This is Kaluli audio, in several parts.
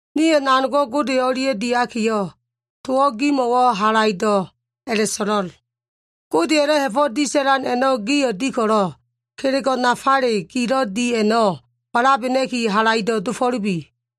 Nio꞉ nanogo꞉ Gode o꞉lia꞉ diakiyo꞉, towo꞉ gimo꞉wo꞉ halaido꞉ a꞉la꞉so꞉lo꞉l, “Godeya꞉lo꞉ ha꞉fo꞉ disa꞉lan man a꞉no꞉ gio꞉ di ko꞉lo꞉, kelego꞉ nafale gilo꞉ di a꞉no꞉ walabena꞉ki halaido꞉ dofo꞉lubi.”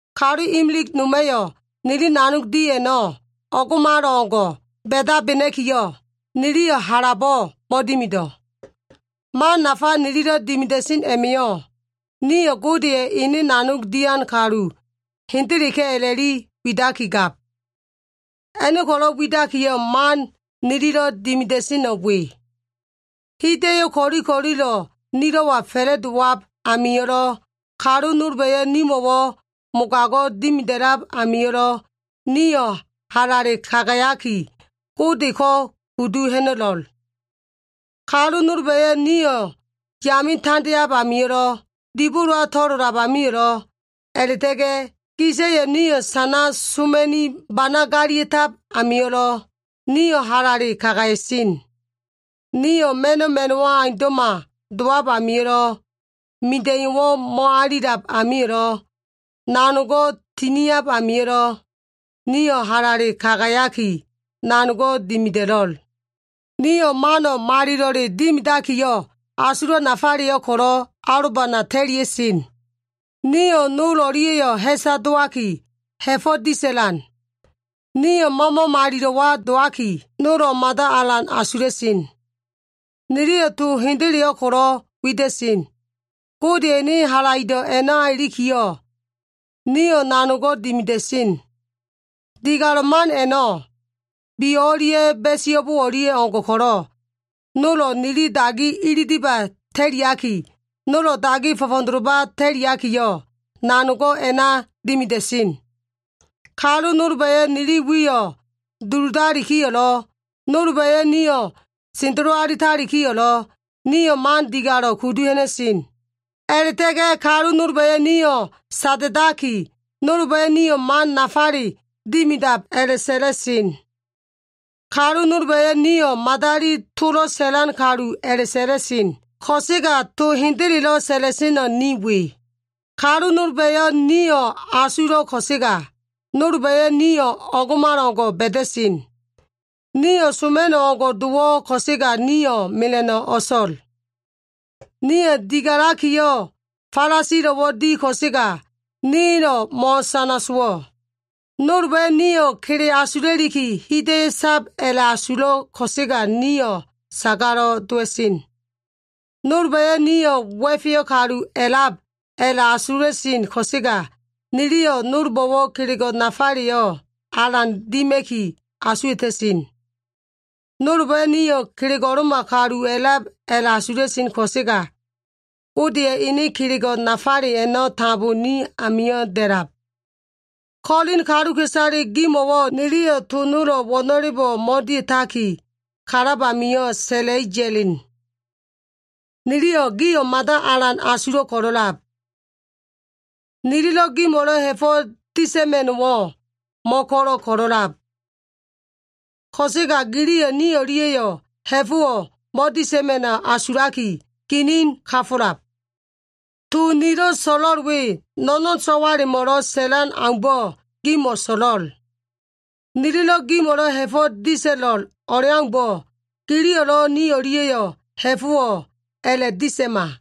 Kalu imilig noma꞉yo꞉ nili nanog di a꞉no꞉ o꞉ngo꞉malo꞉ngo꞉ ba꞉dabena꞉kiyo꞉, niliyo꞉ halabo꞉ mo꞉dimido꞉. Man nafa nililo꞉ dimida꞉sen a꞉ma꞉yo꞉, nio꞉ Godeya꞉ ene nanog dian kaluka꞉isale hendeleka꞉ a꞉la꞉li widakigab. A꞉no꞉ ko꞉lo꞉ widakiyo꞉, man nililo꞉ dimida꞉seno꞉ we. Hida꞉yo꞉ ko꞉li ko꞉lilo꞉ nilo꞉wa fa꞉la꞉dowab amio꞉lo꞉, kalu nolba꞉yo꞉ nimo꞉wo꞉ mogago꞉ dimida꞉lab amio꞉lo꞉, nio꞉ halale kagayaki, Godeko꞉ kudu ha꞉na꞉lo꞉l. Kalu nolba꞉yo꞉ nio꞉ yame tandeab amio꞉lo꞉, dibolowa to꞉lolab amio꞉lo꞉, a꞉la꞉ta꞉ga꞉ gisa꞉yo꞉ nio꞉ sana soma꞉ni bana galia꞉tab amio꞉lo꞉, nio꞉ halale kagaya꞉sen. Nio꞉ ma꞉no꞉ ma꞉no꞉wo꞉ aundo꞉ma dowab amio꞉lo꞉, mida꞉iyo꞉wo꞉ mo꞉alilab amio꞉lo꞉, nanogo꞉ tiniab amio꞉lo꞉, nio꞉ halale kagayaki, nanogo꞉ dimida꞉lo꞉l. Nio꞉ mano꞉ malilo꞉le dimidakiyo꞉, asulo꞉ nafaleyo꞉ ko꞉lo꞉ alobana ta꞉lia꞉sen. Nio꞉ nol o꞉lia꞉yo꞉ ha꞉sa dowaki, ha꞉fo꞉ disa꞉lan. Nio꞉ Mama Malilo꞉wa dowaki, nolo꞉ mada alan asula꞉sen. Niliyo꞉ to hendeleyo꞉ ko꞉lo꞉ wida꞉sen. Godeya꞉ ene halaido꞉ a꞉na ilikiyo꞉, nio꞉ nanogo꞉ dimida꞉sen. Digalo꞉ man a꞉no꞉, biyo꞉ o꞉lia꞉ ba꞉iso꞉bo o꞉lia꞉ o꞉ngo꞉ ko꞉lo꞉, nolo꞉ nili dagi ililiba꞉ ta꞉liaki, nolo꞉ dagi fo꞉fo꞉doloba꞉ ta꞉liakiyo꞉, nanogo꞉ a꞉na dimida꞉sen. Kalu nolba꞉yo꞉ nili wiyo꞉ duludalikiyo꞉lo꞉, nolba꞉yo꞉ nio꞉ sendelo alitalikiyo꞉lo꞉, nio꞉ man digalo꞉ kudu ha꞉na꞉sen. A꞉la꞉ta꞉ga꞉ kalu nolba꞉yo꞉ niyo꞉ sada꞉daki, nolba꞉yo꞉ nio꞉ man nafale dimidab a꞉la꞉sa꞉la꞉sen. Kalu nolba꞉yo꞉ nio꞉ madali tolo꞉ sa꞉lan kalu a꞉la꞉sa꞉la꞉sen ko꞉sega, to hendelelo꞉ sa꞉la꞉seno꞉ ni we. Kalu nolba꞉yo꞉ nio꞉ asulo꞉ ko꞉sega, nolba꞉yo꞉ nio꞉ o꞉ngo꞉malo꞉ngo꞉ ba꞉da꞉sen. Nio꞉ soma꞉no꞉ o꞉ngo꞉ dowo꞉ ko꞉sega nio꞉ mela꞉no꞉ o꞉so꞉l. Nio꞉ digalakiyo꞉ falasilo꞉wo꞉ di ko꞉sega, nilo꞉ mo꞉sana sowo꞉. Nolba꞉yo꞉ nio꞉ kele asula꞉liki hida꞉yo꞉ sab a꞉la꞉asulo꞉ ko꞉sega nio꞉ sagalo꞉ dowa꞉sen. Nolba꞉yo꞉ nio꞉ wa꞉feyo꞉ kalu a꞉lab a꞉la꞉asula꞉sen ko꞉sega, niliyo꞉ nolbo꞉wo꞉ kelego꞉ nafaleyo꞉ alan dima꞉ki asuwa꞉ta꞉sen. Nolba꞉yo꞉ nio꞉ kelego꞉lo꞉ma kalu a꞉lab a꞉la꞉asula꞉sen ko꞉sega, Godeya꞉ ene kelego꞉ nafale a꞉no꞉ tambo ni amio꞉ da꞉lab. Kolin kaluka꞉isale gimo꞉wo꞉ niliyo꞉ to nolo꞉ wo꞉no꞉lebo꞉ mo꞉dia꞉taki, kalab amio꞉ sa꞉la꞉i ya꞉len. Niliyo꞉ gio꞉ mada alan asulo꞉ ko꞉lo꞉lab. Nililo꞉ gimo꞉lo꞉ ha꞉fo꞉ disa꞉ma꞉no꞉wo꞉ mo꞉ko꞉lo꞉ ko꞉lo꞉lab. Ko꞉sega giliyo꞉ ni o꞉lia꞉yo꞉ ha꞉fo꞉wo꞉ mo꞉disa꞉ma꞉no꞉ asulaki, ginin kafo꞉lab. To nilo꞉ so꞉lo꞉l we, no꞉no꞉n so꞉walemo꞉lo꞉ sa꞉lan aumbo꞉ gimo꞉ so꞉lo꞉l. Nililo꞉ gimo꞉lo꞉ ha꞉fo꞉ disa꞉lo꞉l o꞉leaumbo꞉, giliyo꞉lo꞉ ni o꞉lia꞉yo꞉ ha꞉fo꞉wo꞉ a꞉la꞉disa꞉ma.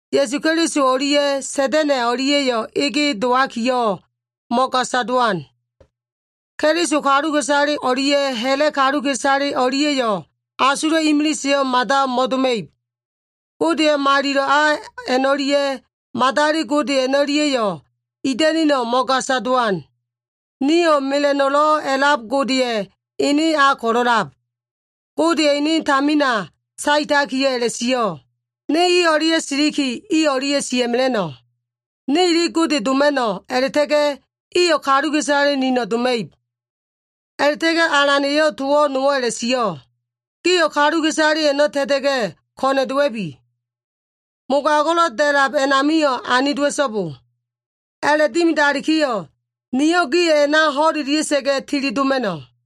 Ya꞉su Keliso o꞉lia꞉ Sa꞉da꞉na꞉ o꞉lia꞉yo꞉ ege dowakiyo꞉ mo꞉gasa dowan. Keliso kaluka꞉isale o꞉lia꞉ ha꞉la꞉ kaluka꞉isale o꞉lia꞉yo꞉ asulo꞉ imiliseyo꞉ mada mo꞉doma꞉ib. Godeya꞉ malilo꞉ a a꞉no꞉lia꞉ madali gode a꞉no꞉lia꞉yo꞉ ida꞉nino꞉ mo꞉gasa dowan. Nio꞉ mela꞉no꞉lo꞉ a꞉lab Godeya꞉ ene a ko꞉lo꞉lab. Godeya꞉ ene tamina saetakiyo꞉ a꞉la꞉sio꞉, “Ne i o꞉lia꞉ siliki, i o꞉lia꞉ sia꞉mela꞉no꞉. Ne ili Gode doma꞉no꞉, a꞉la꞉ta꞉ga꞉ iyo꞉ kaluka꞉isale nino꞉ doma꞉ib.” A꞉la꞉ta꞉ga꞉ Alan eyo꞉ to nowo꞉ a꞉la꞉sio꞉, “Gio꞉ kaluka꞉isale a꞉no꞉ ta꞉ta꞉ga꞉, ko꞉na꞉ dowa꞉bi. Mogago꞉lo꞉ da꞉lab a꞉namio꞉ ani dowa꞉so꞉bo. A꞉la꞉dimidalikiyo꞉, niyo꞉ gio꞉ a꞉na ho꞉lelia꞉sa꞉ga꞉ tilidoma꞉no꞉.”